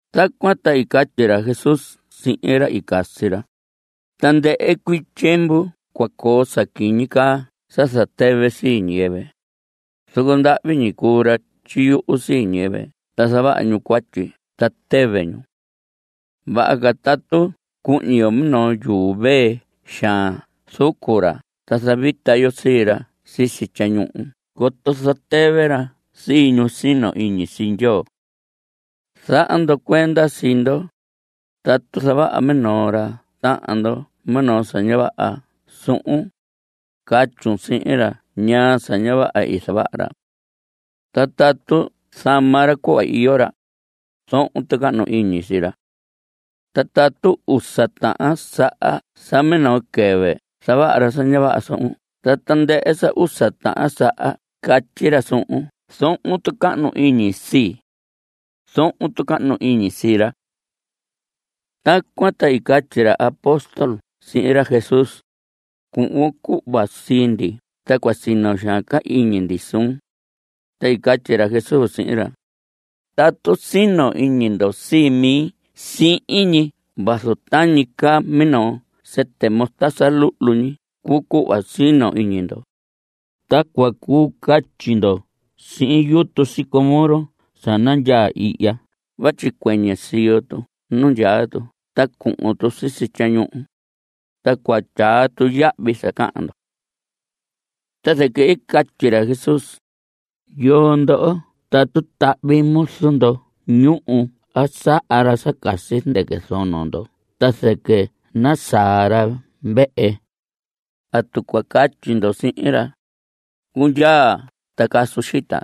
Tacuan ta i catyi ra Jesús sihin ra i casi ra: Tandɨhɨ cuii tyiemvu cua coo sa quiñi caa sa zatɨvɨ sii ñiyɨvɨ, zoco ndahvi ñi cuu ra tyiyuhu sii ñiyɨvɨ ta zavaha ñu cuatyi ta tɨvɨ ñu. Vaha ca tatu cuhñi yo minoo yuu vee xaan zucu ra ta zavita yo sii ra sisi tyañuhu coto zatɨvɨ ra sii ñu sino iñi sii Ndyoo. Zaha ndo cuenda sii ndo. Tatu zavaha minoo ra tahan ndo minoo sa ña vaha suhun, catyun sihin ra ñaa sa ña vaha i zavaha ra. Ta tatu zama ra cuhva iyo ra, zohon tucahnu iñi sii ra. Ta tatu usa tahan saha sa minoo quɨvɨ zavaha ra sa ña vaha suhun ta tandɨhɨ usa tahan saha catyi ra suhun: “Zohon tucahnu iñi sii.” Zohon tucahnu iñi sii ra. Tacuan ta i catyi ra apóstol sihin ra Jesús: Cuhvon cuhva sii ndi ta cua sino xaan ca iñi ndi suun. Ta i catyi ra Jesús sihin ra: Tatu sino iñi ndo sii mi siin ñi vazu tañi caa minoo sɨtɨ mostaza luhlu ñi cuu cuhva sino iñi ndo, ta cua cuu catyi ndo sihin yutu sicómoro sa nandyaa ihya vatyi cuɨñɨ siyo tu nu ndyaa tu ta cuhun tu sisi tyañuhu, ta cua tyaa tu yahvi sa cahan ndo. Ta zɨquɨ i catyi ra Jesús: Yoo ndoho tatu tahvi muzu ndo ñuhu a saha ra sa casi zɨndɨquɨ zono ndo ta zɨquɨ nasaa ra vehe, ¿atu cua catyi ndo sihin ra: “Cundyaa ta casun xita”?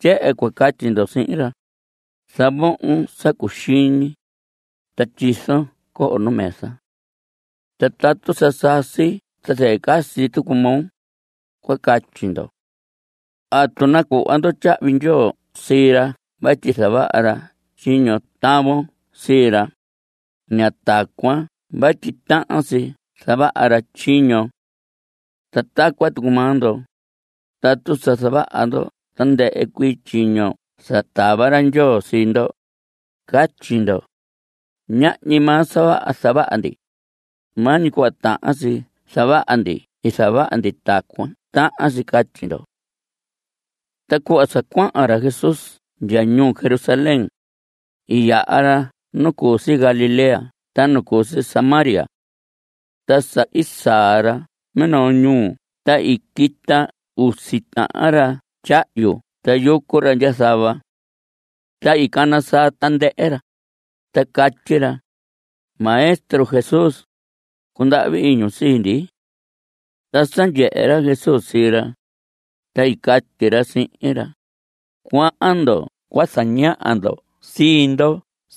Tyehen cua catyi ndo sihin ra: “Zavohon sa cuxiñi, ta tyizon coho nu mesa. Ta tatu sa sasi ta zɨquɨ casi tucu moo.” Cua catyi ndo. ¿Atu nacuhvon tyahvi ndyoo sii ra vatyi zavaha ra tyiño tavon sii ra? Ña tacuan vatyi tahan si zavaha ra tyiñon. Ta tacuan tucu maa ndo. Tatu sa zavaha ndo tandɨhɨ cuii tyiño sa tava ra Ndyoo sii ndo. Catyi ndo: “Ñahñi maa sa vaha zavaha ndi. Maa ñi cuhva tahan si zavaha ndi i zavaha ndi.” Tacuan tahan si catyi ndo. Ta cuhva sa cuahan ra Jesús ndya ñuu Jerusalén, i yaha ra nu cu si Galilea ta nu cu si Samaria. Ta sa i saa ra minoo ñuu ta i quita usi tahan ra tyahyu ta yucu ra ndya zava. Ta i cana saa tandɨhɨ ra, ta catyi ra: Maestro Jesús, cundahvi iñun sii ndi. Ta sa ndyehe ra Jesús sii ra, ta i catyi ra sihin ra: Cuahan ndo cua zañaha ndo sii ndo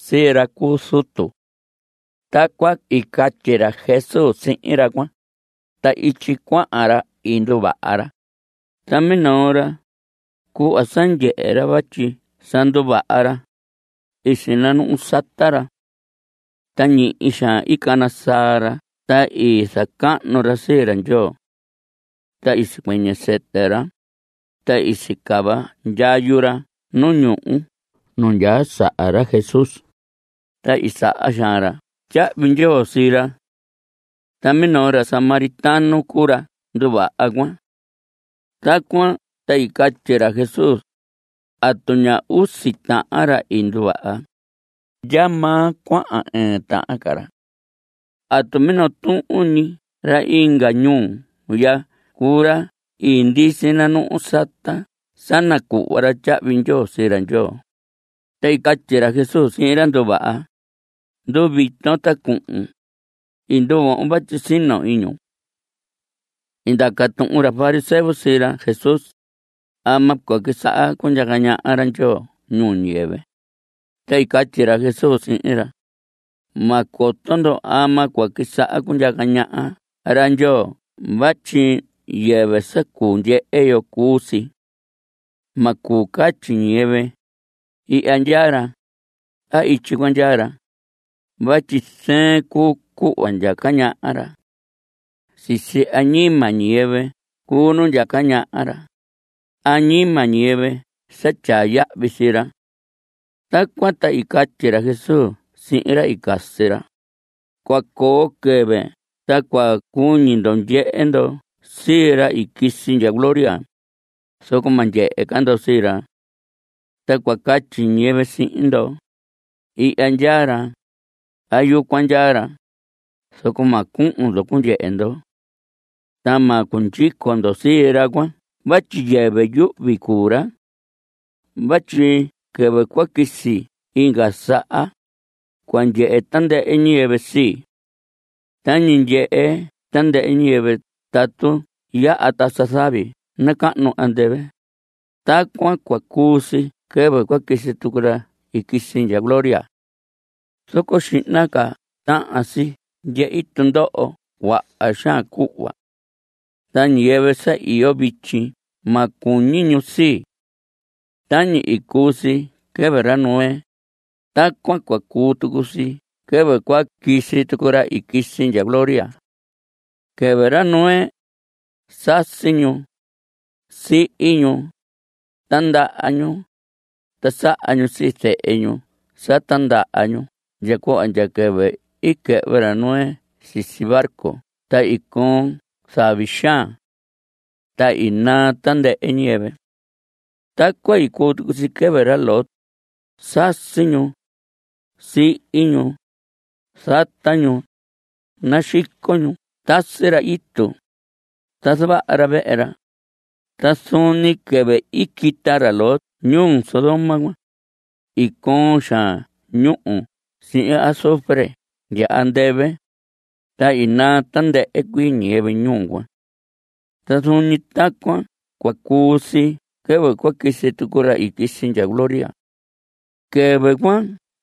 sii ra cu zutu. Tacuan i catyi ra Jesús sihin ra cuan, ta ityi cuahan ra i nduvaha ra. Ta minoo ra, cuhva sa ndyehe ra vatyi sa nduvaha ra, i sinanuhu sata ra. Ta ñihi xaan i cana saa ra ta i zacahnu ra sii ra Ndyoo. Ta i sicuɨñɨ sɨtɨ ra, ta i sicava ndyayu ra nu ñuhu nu ndyaa saha ra Jesús, ta i saha xaan ra tyahvi ndyoo sii ra. Ta minoo ra samaritano cuu ra nduvaha cuan. Tacuan ta i catyi ra Jesús: ¿Atu ña usi tahan ra i nduvaha? ¿Ndyamaa cuahan ɨɨn tahan ca ra? ¿Atu minoo tuhun ñi ra inga ñuu ya cuu ra i ndisi nanuhu sata sa nacuhva ra tyahvi ndyoo sii ra Ndyoo? Ta i catyi ra Jesús sihin ra i nduvaha: Nduvita ta cuhun. I nduvohon vatyi sino iñun. I ndaca tuhun ra fariseo sii ra Jesús: ¿Ama cua quisaha cundyaca ñaha ra Ndyoo ñuu ñiyɨvɨ? Ta i catyi ra Jesús sihin ra: Ma coto ndo ama cua quisaha cundyaca ñaha ra Ndyoo vatyi yɨvɨ sa cuu ndyehe yo cuu si. Ma cuu catyi ñiyɨvɨ: “Ihya ndyaa ra”, a “Ityi cuan ndyaa ra” vatyi zɨɨn cuu cuhva ndyaca ñaha ra. Sisi añima ñiyɨvɨ cuu nu ndyaca ñaha ra, añima ñiyɨvɨ sa tyaa yahvi sii ra. Tacuan ta i catyi ra Jesús sihin ra i casi ra: Cua coo quɨvɨ ta cua cuñi ndo ndyehe ndo sii ra i quisi ndya gloria, zoco ma ndyehe ca ndo sii ra. Ta cua catyi ñiyɨvɨ sihin ndo: “Ihya ndyaa ra”, a “Yucuan ndyaa ra.” Zoco ma cuhun ndo cundyehe ndo. Ta ma cundyico ndo sii ra cuan vatyi yɨvɨ yuhvi cuu ra. Vatyi quɨvɨ cua quisi inga saha, cua ndyehe tandɨhɨ ñiyɨvɨ sii. Tañi ndyehe tandɨhɨ ñiyɨvɨ tatu yaha tasa zavi nacahnu andɨvɨ, tacuan cua cuu si quɨvɨ cua quisi tucu ra i quisi ndya gloria. Zoco xihna ca tahan si ndyehi tundoho cuaha xaan cuhva. Ta ñiyɨvɨ sa iyo vityi ma cuñi ñu sii. Tañi i cuu si quɨvɨ ra Noé, tacuan cua cuu tucu si quɨvɨ cua quisi tucu ra i quisi ndya gloria. Quɨvɨ ra Noé, sasi ñu. Sihi ñu. Tindaha ñu. Ta saha ñu sii zehe ñu sa tindaha ñu ndya cuhva ndya quɨvɨ i quɨhvɨ ra Noé sisi barco ta i coon zavi xaan. Ta i naa tandɨhɨ ñiyɨvɨ. Tacuan i cuu tucu si quɨvɨ ra Lot. Sasi ñu. Sihi ñu. Zata ñu. Naxico ñu. Tasi ra itu. Ta zavaha ra vehe ra. Ta zuun ñi quɨvɨ i quita ra Lot ñuu Sodoma cuan, i coon xaan ñúhu sihin azufre ndya andɨvɨ, ta i naa tandɨhɨ cuii ñiyɨvɨ ñuu cuan. Ta zuun ñi tacuan cua cuu si quɨvɨ cua quisi tucu ra i quisi ndya gloria. Quɨvɨ cuan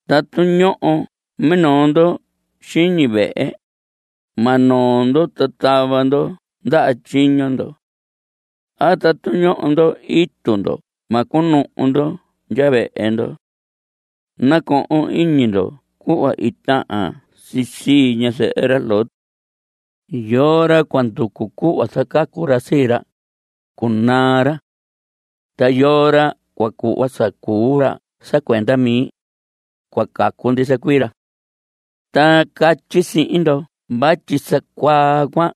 tatu ñoho minoo ndo xiñi vehe, ma noo ndo ta tava ndo ndaha tyiño ndo. A tatu ñoho ndo itu ndo ma cunuhu ndo ndya vehe ndo. Nacohon iñi ndo cuhva i tahan si sii ñazɨhɨ ra Lot. Yoo ra cua nducu cuhva zacacu ra sii ra, cunaa ra. Ta yoo ra cua cuhva sa cuu ra sa cuenda mi, cua cacu ndisa cuii ra. Ta catyi sihin ndo vatyi sa cuaa cuan,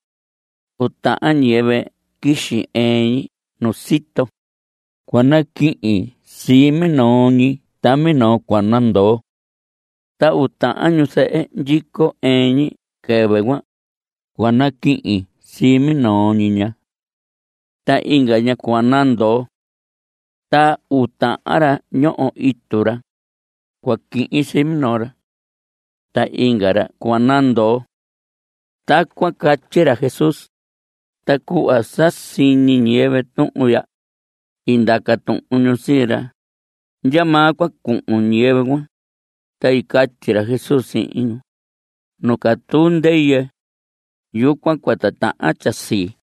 uu tahan ñiyɨvɨ quixi ɨɨn ñi nu sito. Cua naquihin sii minoo ñi ta minoo cua nandoo. Ta uu tahan ñuzɨhɨ ndyico ɨɨn ñi quɨvɨ cuan, cua naquihin sii minoo ñi ña. Ta inga ña cua nandoo. Ta uu tahan ra ñoho itu ra, cua quihin sii minoo ra. Ta inga ra cua nandoo. Tacuan catyi ra Jesús. Ta cuhva sa siñi ñiyɨvɨ tuhun ya, i ndaca tuhun ñu sii ra: ¿Ndyamaa cua cuhun ñiyɨvɨ cuan? Ta i catyi ra Jesús sihin ñu: Nu catuu ndɨyɨ, yucuan cua titahan tyasii.